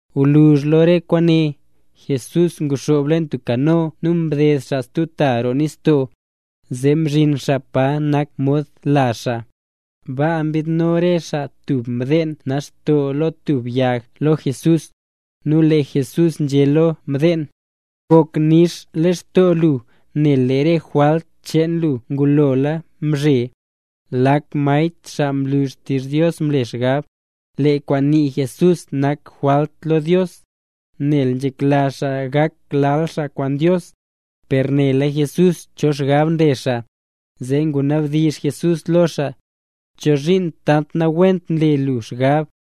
Gwluzh lo re kwaane, Jesús nguxoob leen tub kano nu mded xaa stub ta roo nistoo, zee mzhin xaa pa nak mod lazh xaa. Baa mbidno re xaa tub mdeen nax lo tub yag lo Jesús. Nu lee Jesús nzhé lo mdeen: —Gok nix lextoo lu nel lee re jwalt cheen lu ngulola mzhe. Lak maestr xaa nlu xtizh Dios nle xgab: —Lee kwaan nii Jesús nak jwalt lo Dios, nel nzhekla xaa gak lal xaa kwaan Dios. Per nela Jesús cho xgab nle xaa, zee ngunabdizh Jesús lo xaa: —¿Chozhiin tant nawent nle gu xgab?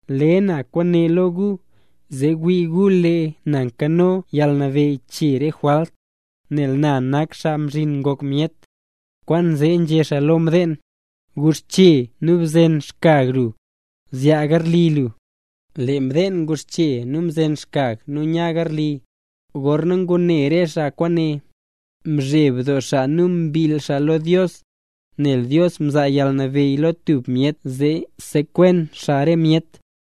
Le na kwaane lo gu, zee wii gu lee na nkano yalnabeyy chee re jwalt, nel na nak Xaa Mzhin Ngok Myet. Kwaanzee nzhé xaa lo mdeen: —Guxche nu bzen xkyag lu, zyaa garli lu. Lee mdeen nguxche nu mzen xkyag nu nya garli. Gorna ngune re xaa kwaane, mzheb doo xaa nu mbill xaa lo Dios, nel Dios mzaa yalnabeyy lo tub myet zee sekwen xaa re myet.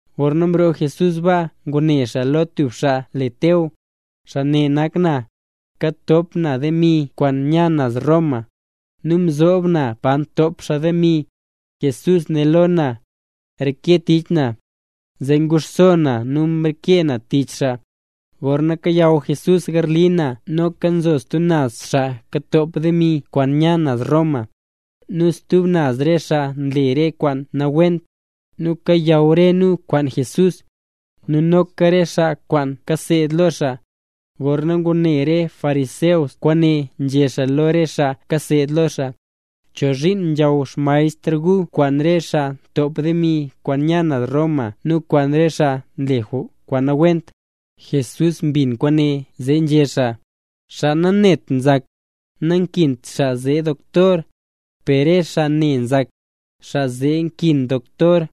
Gorna mroo Jesús baa ngune xaa lo tub xaa le Teo, xaa ne nak na. Katop na demi kwaan nya naz Roma, nu nzob na pa ntop xaa demi. Jesús né lo na: —Reke tich na. Zee nguxso na nu mreke na tich xaa. Gorna kayaw Jesús garli na, noka nzo stub naz xaa ntop demi kwaan nya naz Roma, nu stub naz re xaa nle re kwaan nawent, nu kayaw re nu kwaan Jesús, nu noka re xaa kwaan kaseed lo xaa. Gorna ngune re fariseo kwaane nzhé xaa lo re xaa kaseed lo Jesús: —¿Chozhiin nzhaw xmaestr gu kwaan re xaa ntop demi kwaan nya naz Roma nu kwaan re xaa nle kwaan nawent? Jesús mbin kwaane zee nzhé xaa: —Xaa nanet nzak, nankint xaa zee doktor, per re xaa ne nzak, xaa zee nkin doktor.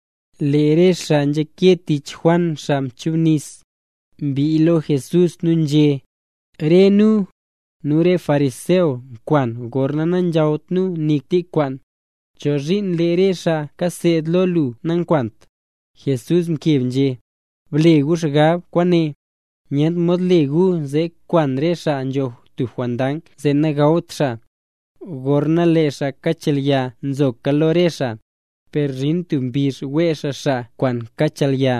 Lee re xaa nzhake tich Juan Xaa Nchubnis, mbii lo Jesús nu nzhé: —Re nu, nu re fariseo nkwan gorna nanzhawt nu nik tik kwaan. ¿Chozhiin lee re xaa kaseed lo lu nankwant? Jesús mkeb nzhé: —Ble gu xgab kwaane. Nyent mod le gu zee kwan re xaa nzho tub jondang zee nagawt xaa, gorna lee xaa kachelya nzoka lo re xaa. Per zhin tub mbizh wee xaa xaa kwaan kachelya,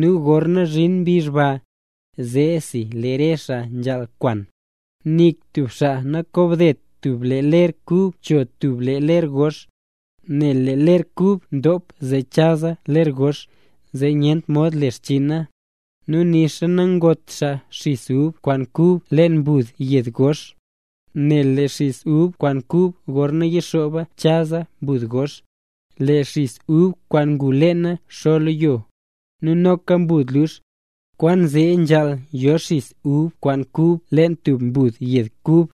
nu gorna zhin mbizh ba, zeesi lee re xaa nzhaal kwan. ’Nik tub xaa nakobdet tub lee ler kub cho tub lee ler gox, nel lee ler kub ndop zee chaza ler gox, zee nyentra mod le xchiina. Nu nixa nangot xaa xis ub kwaan kub leen mbud yed gox, nel lee xis ub kwaan kub gorna yixooba chaza mbud gox. Lee xis ub kwaan ngu leena xo lo yo, nu noka mbud lux. Kwaanzee nzhaal yo xis ub kwaan kub leen tub mbud yed kub.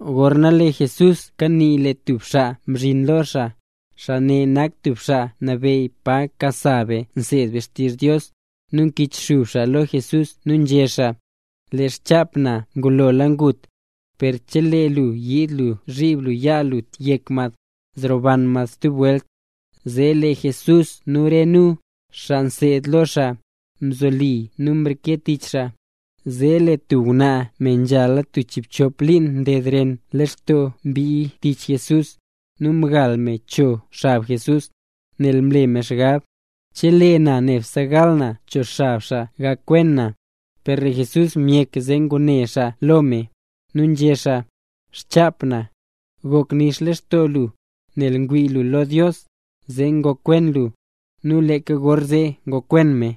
Gorna lee Jesús kanii lee tub xaa mzhin lo xaa, xaa ne nak tub xaa nabeyy pa nkasa be nseed be xtizh Dios, nu mkichxub xaa lo Jesús nu nzhé xaa: —Lee xchap na ngulola ngut. Per chelee lu yiid lu zhib lu yaa lu yek mad, zroban mad stub welt. Zee lee Jesús nu re nu, xaa mseed lo xaa, mzoli nu mreke nu tich xaa. Zee lee tub ngwnaa, me nzhala tub chiibchop liin nded ren lextoo mbii tich Jesús, nu mgal me cho xab Jesús. Nel mle me xgab: “Chelee na nebse gal na cho xab xaa gakwen na”. Per lee Jesús myek zee ngune xaa lo me, nu nzhé xaa: —Xchap na. Gok nix lextoo lu, nel mwii lu lo Dios, zee ngokwen lu. Nu leeka gorzee ngokwen me.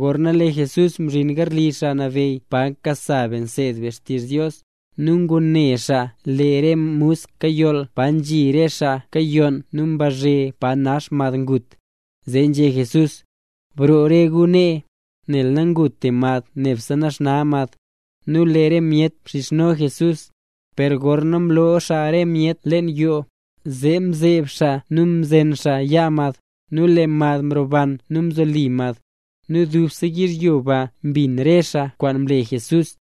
Gorna lee Jesús mzhin garli xaa nabeyy pa nkasa be nseed be xtizh Dios, nu ngune xaa lee re musk kayoll paro nzhi re xaa kayonn doo nu mbazhe, pa nax mad ngut. Zee nzhé Jesús: —Broo re gu nee, nel nanguta mad, nebse naxna mad. Nu lee re myet mxizhno Jesús. Per gorna mloo xaa re myet leen yoo, zee mzeb xaa nu mzen xaa yaa mad, nu lee mad mroban nu mzoli mad. Nu dubse yizhyo ba mbin re xaa kwaan mle Jesús.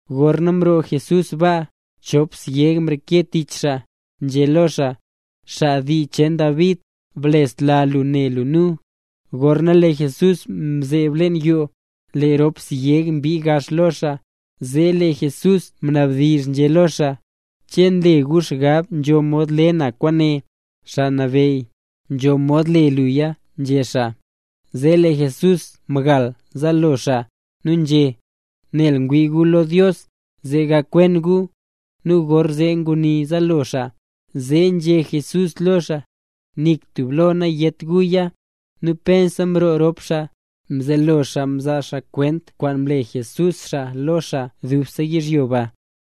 Gorna mroo Jesús baa, chop syeg mreke tich xaa, nzhé lo xaa: —¡Xaa dii cheen David, blesla lu ne lu nu! Gorna lee Jesús mzeeb leen yoo, lee rop syeg mbii gax lo xaa, zee lee Jesús mnabdizh nzhé lo xaa: —¿Che nle gu xgab nzho mod le na kwaane? —Xaa Nabeyy, nzho mod le luya —nzhé xaa. Zee lee Jesús mgal zaalo xaa, nu nzhé: —Nel ngwii gu lo Dios, zee gakwen gu. Nu gorzee nguni zaalo xaa, zee nzhé Jesús lo xaa: —Nik tub lo nayét guya. Nu pensa mroo rop xaa, mzelo xaa mzaa xaa kwent kwaan mle Jesús xaa, lo xaa dubse yizhyo ba.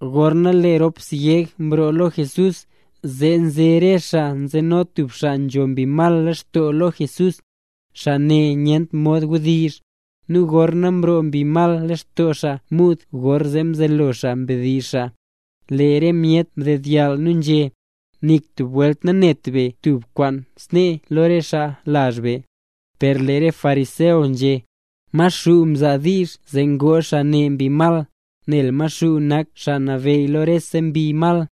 Gorna lee rop syeg mroo lo Jesús, zee nze re xaa nzeno tub xaa nzho mbi mal lextoo lo Jesús. Xaa ne nyent mod wdizh. Nu gorna mroo mbi mal lextoo xaa muud gorzee mzelo xaa mdizh xaa. Lee re myet mdedyall nu nzhé: —¡Nik tub welt nanet be tub kwaan snee lo re xaa lazh be! Per lee re fariseo nzhé: —Maxuu mzaa diizh zee ngoo xaa ne mbi mal, nel Maxuu nak xaa nabeyy lo rese mbi mal.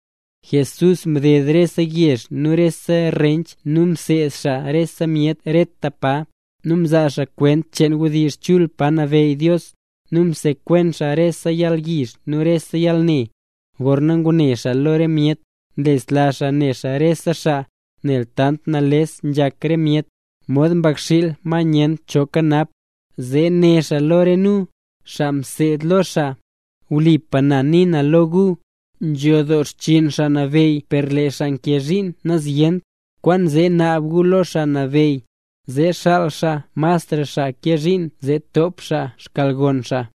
Jesús mded rese yezh nu rese rench nu mseed xaa rese myet reta pa, nu mzaa xaa kwent cheen wdizh chul pa nabeyy Dios, nu msekwen xaa rese yalyizh nu rese yalne. Gorna ngune xaa lo re myet, mlesla xaa ne xaa re xaa, nel tant nales nzhak re myet, mod mbakxiil, ma nyent cho nkanap. Zee né xaa lo re nu, xaa mseed lo xaa: —Wlipa na nii na lo gu, nzho doo xchiin Xaa Nabeyy per lee xaa nkee zhiin nazyent. Kwaanzee naab gu lo Xaa Nabeyy, zee xaal xaa masra xaa kee zhiin zee top xaa xkyalgon xaa.